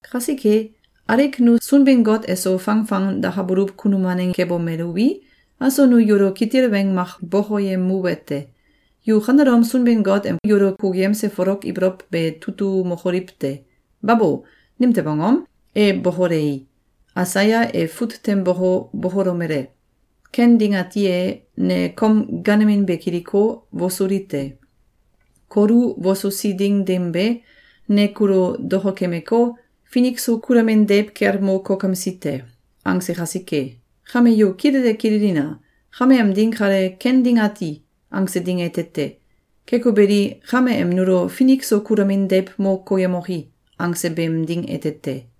Kasike, alik nu Sunbin-Got eso fangfang dakabuluw kunum waneng kebomeluwi, aso nu yulo kitil weng mak bokoyemuwete: Yu kanelom Sunbin-Got em yulo kukuyemse folok ibolow be tutumokoliw te! Babo! Nimtew angom? E bokolei, Aisaya e fut tem boko, bokolomele: “Ken ding ati e, ne kom gaanemin be kiliko, wosuli te. Kulo wosusi ding dim be, ne kulo dokokemeko, finik so kulamin deiw kel mo kokemsi te.”, angse kasike. Kame yu kilele kililina! Kame em ding kale “Ken ding ati!”, angse ding ete te! Keko beli, kame em nulo “Finik so kulamin deiw mo koyemoki!”, angse beem ding ete te!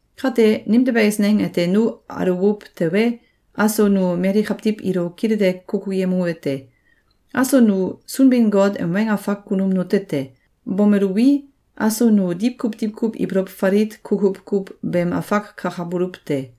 Kate nimtew eisneng ete nu aluwuw tewe, aso nu mali kawtiw ilo kilele kukuyemuwete: Aso nu Sunbin-Got em weng afak kunum nute te! Bomeluwi, aso nu diwkuw diwkuw ibolow falit kukuw kuw beem afak kakabuluw te.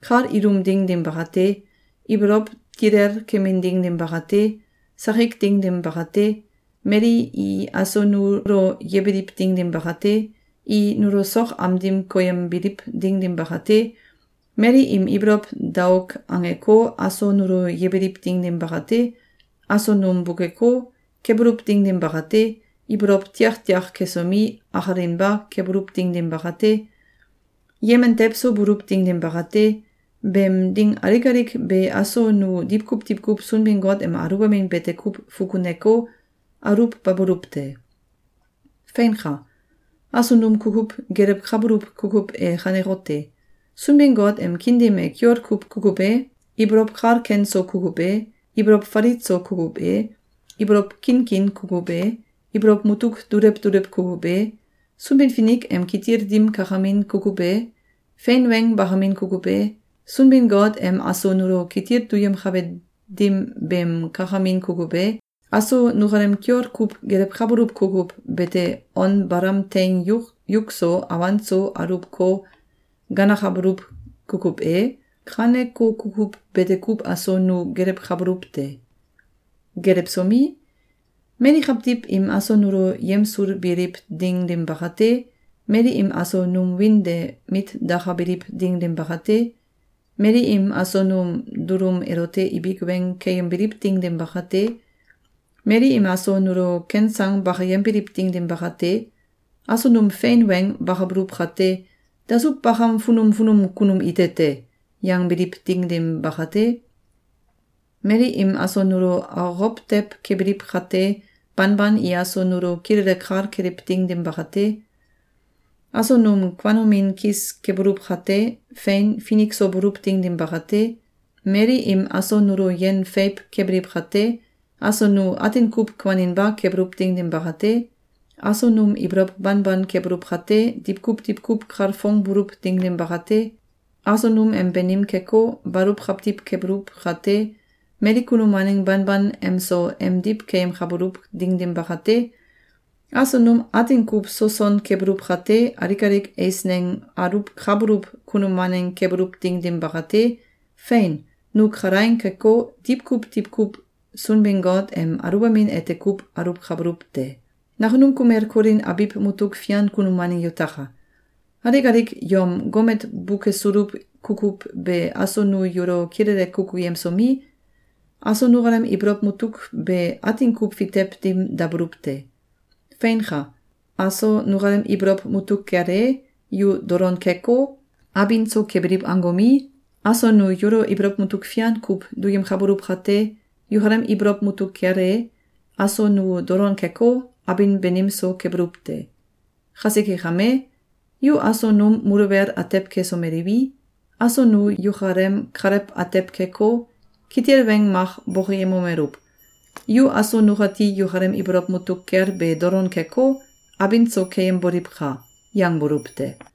Kal ilum ding dim bakate, ibolow tilel kemin ding dim bakate, sakik ding dim bakate, mali i aso nulo yebiliw ding dim bakate, i nulo sok am dim koyembiliw ding dim bakate, mali im ibolow daok angeko, aso nulo yebiliw ding dim bakate, aso num bukeko, kebuluw ding dim bakate, ibolow tiaktiak kesomi, akalinba kebuluw ding dim bakate, yemen tewso buluw ding dim bakate, beem ding alik alik be aso nu diwkuw diwkuw Sunbin-Got em aluwbamin bete kuw fukuneko, aluwbabuluw te. Feinka! Aso num kukuw gelewkabuluw kukuw e kanekote: Sunbin-Got em kiin dim e kiol kuw kukuw e, ibolow kal ken so kukuw e, ibolow falit so kukuw e, ibolow kinkin kukuw e, ibolow mutuk dulew dulew kukuw e, Sunbin-Finik em kitil dim kakamin kukuw e, fein weng bakamin kukuw e, Sunbin-Got em aso nulo kitil duyemkabe dim beem kakamin kukuw e, aso nukalem kiol kuw gelewkabuluw kukuw bete on balam teing yuk so awan so aluwko, ganakabuluw kukuw e, kaneko kukuw bete kuw aso nu gelewkabuluw te. Gelewsomi, mali kawtiw im aso nulo yemsulbiliw ding dim bakate, mali im aso num wiin de mit dakabiliw ding dim bakate, mali im aso num dulum elote ibik weng keyembiliw ding dim bakate, mali im aso nulo ken sang bakayembiliw ding dim bakate, aso num fein weng bakabuluw kate, “Dasuw bakam funum funum kunum ite te!”, yangbiliw ding dim bakate, mali im aso nulo akokow tew kebiliw kate, banban i aso nulo kilele kal keliw ding dim bakate, aso num kuanomin kis kebuluw kate, fein, finik so buluw ding dim bakate, mali im aso nulo yen feiw kebiliw kate, aso nu atin kuw kuaninba kebuluw ding dim bakate, aso num ibolow banban kebuluw kate, diwkuw diwkuw kalfongbuluw ding dim bakate, aso num em banim keko, baluw kawtiw kebuluw kate, mali kunum waneng banban emso emdiw keyemkabuluw ding dim bakate, aso num atin kuw soson kebuluw kate, alik alik eisneng aluwkabuluw kunum waneng kebuluw ding dim bakate, fein, nu kalaing keko, diwkuw diwkuw Sunbin-Got em aluwbamin ete kuw aluwkabuluw te. Nakunum kumel Kolin abiw mutuk fian kunum waneng yutaka! Alik alik yom gomet bukesuluw kukuw be aso nu yulo kilele kukuyemsomi, aso nukalem ibolow mutuk be atin kuw fitew dim dabuluw te. Feinka! Aso nukalem ibolow mutuk kel e, yu dolon keko, abin so kebiliw angomi, aso nu yulo ibolow mutuk fian kuw duyemkabuluw kate, yukalem ibolow mutuk kel e, aso nu dolon keko, abin banim so kebuluw te. Kasike kame, yu aso num muluwel atew kesomeliwi, aso nu yukalem kalew atew keko, kitil weng mak bokoyemomeluw: “Yu aso nukati yukalem ibolow mutuk kel be dolon keko, abin so keyemboliwka!”, yangbuluw te.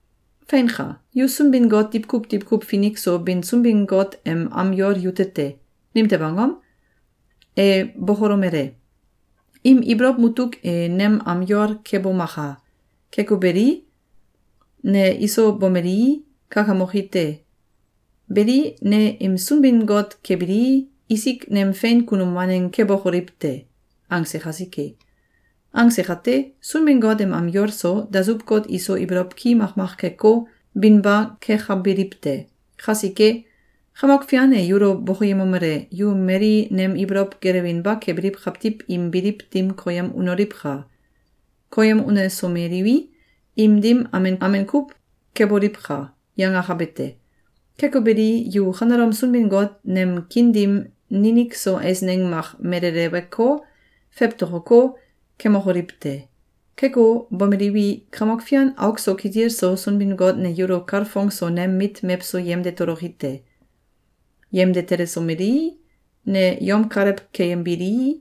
Feinka! Yu Sunbin-Got diwkuw diwkuw finik so bin Sunbin-Got em am yol yute te! Nimtew angom? E bokolomele: “Im ibolow mutuk e nem am yol kebomaka! Keko beli, ne iso bomelii, kakamoki te. Beli, ne im Sunbin-Got kebilii, isik nem fein kunum waneng kebokoliw te!”, angse kasike. Angse kate, Sunbin-Got em am yol so, dasuw-got iso ibolow ki makmak keko, binba kekabiliw te. Kasike, “Kamok Fian e yulo bokoyemomele: ‘Yu mali nem ibolow gelewinba kebiliw kawtiw im biliw dim koyem unoliwka! Koyem unesomeliwi, im dim amen amen kuw keboliwka!’, yangakabe te. Keko beli, yu kanelom Sunbin-Got nem kiin dim ninik so eisneng mak meleleweko, fewtokoko, kemokoliw te! Keko, bomeliwi, Kamok Fian auk so kitil so Sunbin-Got ne yulo kalfong so nem mit mewso yemde toloki te. Yemde telesomelii, ne yom kalew keyembilii,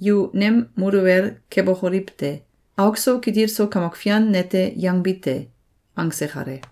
yu nem muluwel kebokoliw te.’, auk so kitil so Kamok Fian nete yangbi te.”, angse kale.